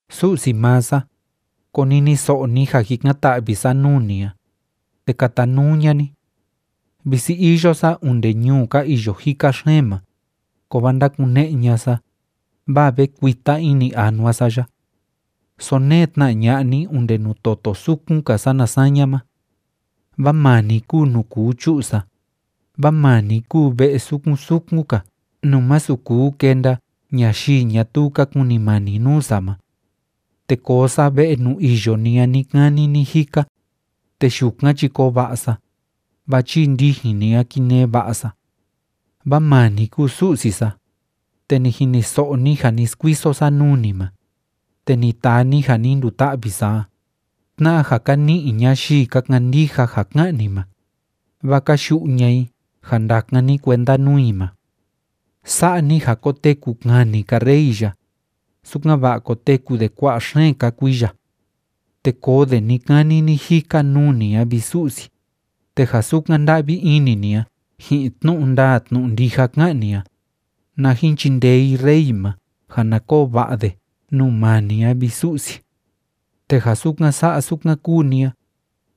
Su'si maa sa, koniniso'o ni ja jikan‑ta'vi sa nuu ni a, te katanuu ña'a ni. Visi iyo sa onde ñuu ka iyo jika xeen ma, kovaa ndákune'e ña'a sa, vaa ve kuita ini anua sa ya. Sonee tna ña'a ni onde nuu toto sukun‑ka sana saña ma. Vaa maa ni kúu nuu kuu chu'u sa, vaa maa ni kúu ve'e sukun sukun‑ka nuu másu kuu kenda ñayii ñatuu ka kunimani nuu sa ma. Te koo sa ve'e nuu iyo ni a ni‑kani ni‑jika, te yukan chi koo va'a sa, vaa chii ndijin ni a kinee va'a sa. Vaa maa ni kúu Su'si sa, te ni jiniso'o ni ja ni skuiso sa nuu ni ma, te ni taa ni ja ni nduta'vi sa a, tna'a ja ka ni'i ñayii ka kandija ja ká'an ni ma, vaa ka yu'u ña'a i ja ndakan ni kuenda nuu i ma. Sa'a ni ja koteku kani‑ka rey ya, sukan‑va'a koteku de kua'a xeen‑ka kuiya. Te koo de ni‑kani ni‑jika nuu ni a, vi Su'si, te ja sukan nda'vi ini ni a ji'in tnu'u ndaa tnu'u ndija ká'an ni a, na jin chindee i rey ma ja na koo va'a de nuu maa ni a, vi Su'si. Te ja sukan sa'a sukan kúu ni a,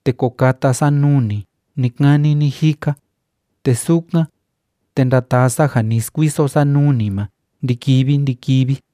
te ko kata sa nuu ni ni‑kani ni‑jika, te sukan, te ndataa sa ja ni skuiso sa nuu ni ma ndi‑kivi ndi‑kivi.